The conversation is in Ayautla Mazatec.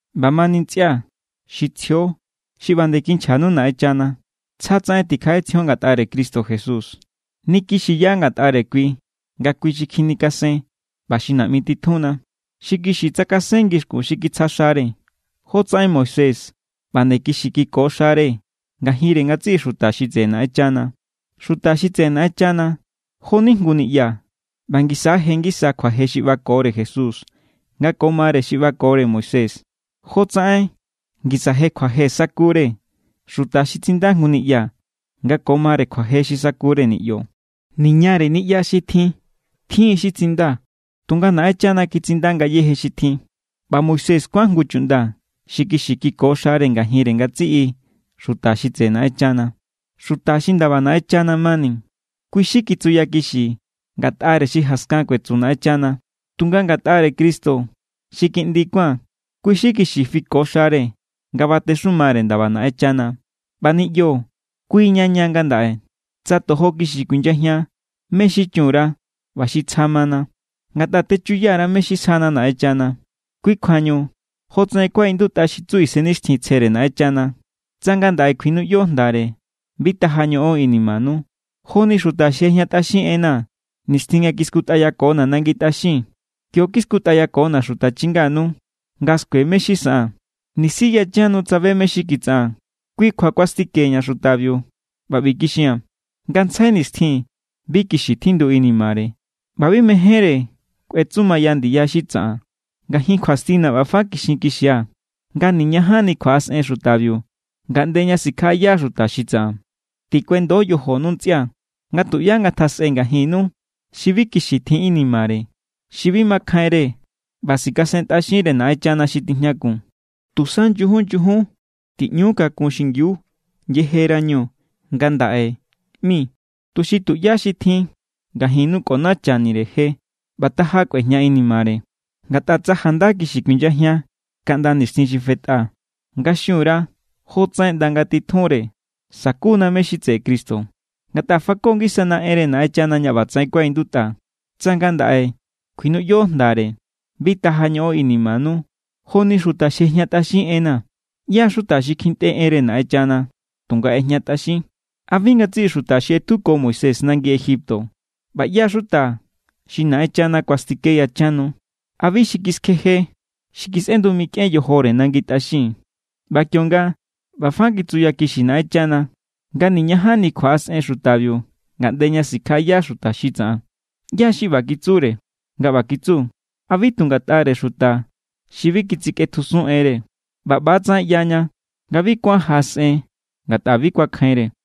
ꞌBamani, ntsꞌia̱ xi tsjio xi ꞌba nde kinchjanu Naꞌenchana, tsjatsaꞌen tikjaꞌetsjion ngatꞌare Cristo Jesús. Nikixiya ngatꞌare kui nga kui xi kjinikasen ꞌba xi naꞌmi titjunna. Xi kixi tsakasen ngixkun xi kitsja xare, jotsaꞌen Moisés ꞌba nde kixi kiko xare ngajinre ngatsiꞌi xuta xi tseꞌe Naꞌenchana. Xuta xi tseꞌe Naꞌenchana, jo=ni jngu niꞌya. ꞌBa ngisa= je ngisa kjuaje xi ꞌbakore Jesús nga ko mare xi ꞌbakore Moisés, jotsaꞌen ngisa je kjuaje sakure xuta xi tsinda jngu niꞌya nga ko mare kjuaje xi sakure niꞌyo. Niñare niꞌya xi tjin tjin= xi tsinda, tunga Naꞌenchana kitsinda ngayéje xi tjin. ꞌBa Moisés kuán jngu chuꞌnda xi kixi kiko xare ngajinre ngatsiꞌi xuta xi tseꞌe Naꞌenchana, xuta xi ndaba Naꞌenchana mani. Kui xi kitsuyakixi ngatꞌare xi jaskan kuetsu Naꞌenchana. Tunga ngatꞌare Cristo xi Kiꞌndi kuán, kui xi kixi= fiko xare nga batexumare ndaba Naꞌenchana. ꞌBa niꞌyo, kuiña ña ngandaꞌe, tsa tojo kixi kuinyajian mé= xi chun_ra ꞌba xi tsja mana, ngatꞌa techuya_ra mé= xi sjana Naꞌenchana. Kui kjuañu jotsaꞌen kuaꞌindutꞌa xi tsu Isennixtjintsjere Naꞌenchana: Tsa ngandaꞌe kjuinuꞌyo jndare, bi taja ñoꞌon inimanu, joni xuta xi ꞌejñatꞌaxin enna̱, nixtjin nga kiskutꞌayakona̱ nangi tꞌaxin. Kio kiskutꞌayakona̱ xuta chinganu nga skue mé= xi saꞌaa̱n, nisi yachan nu tsabe mé= xi kitsaꞌaa̱n. Kui kjua kuastikeña̱ xutabiu, ꞌba ꞌbi kixia̱n: “Ngantsjai nixtjin bi kixi tjindu inimare, ꞌba bi mejénre kꞌuetsumaya ndiya xi tsaꞌan.” Ngajin kjuastina̱ ꞌba fa kixinkixia̱, nga niñajanni kjuaꞌasꞌen xutabiu ngaꞌnde ña sikjaꞌaya xuta xi tsaꞌan. Tikuendo yojonu ntsꞌia̱, nga tuꞌyá ngatjasꞌe ngajinnu xi bi kixi tjin inimare, xi bi makjainre ꞌba sikasentꞌaxinre Naꞌenchana xi tijñakun. Tusa nyujun nyujun tiꞌñu kakun xingiu yejerañu “ngandaꞌe” ꞌmi, tuxi tuꞌyá xi tjin ngajinnu kꞌonachanire je ꞌba taja kꞌuejña inimare. Ngatꞌa tsa janda kixi kjuinyajian kaꞌnda nixtjin xi fetꞌa nga xun_ra jotsaꞌen ꞌnda ngatitjunre, sakuna mé= xi tseꞌe Cristo. Ngatꞌa fako ngisana enre Naꞌenchana ña ꞌbatsaꞌen kuaꞌindutꞌa: “Tsa ngandaꞌe kjuinuꞌyo jndare, bi taja ñoꞌon inimanu joni xuta xi ꞌejñatꞌaxin enna̱.” ¿ꞌYá= xuta xi kjintꞌe enre Naꞌenchana, tunga ꞌejñatꞌaxin? ¿A bi ngatsiꞌi xuta xi ꞌetjuko Moisés nangi Egipto? ¿ꞌBa ꞌyá= xuta xi Naꞌenchana kuastike yachan nu? ¿A bi xi kiskjeje, xi kisꞌendu mikꞌen yojore nangi tꞌaxin? ꞌBa kionga ꞌba fa kitsukixi Naꞌenchana nga: “Niñajanni kjuaꞌasꞌen xutabiu ngaꞌnde ña sikjaꞌaya xuta xi tsaꞌan”, ¿ꞌyá= xi ꞌba kitsure nga ꞌba kitsu? ¿A bi tu ngatꞌare xuta xi bi kitsikꞌetjusun enre? ꞌBa ꞌba=tsaꞌen ꞌyaña nga bi kuán jaꞌasꞌen ngatꞌa bi kuakjainre.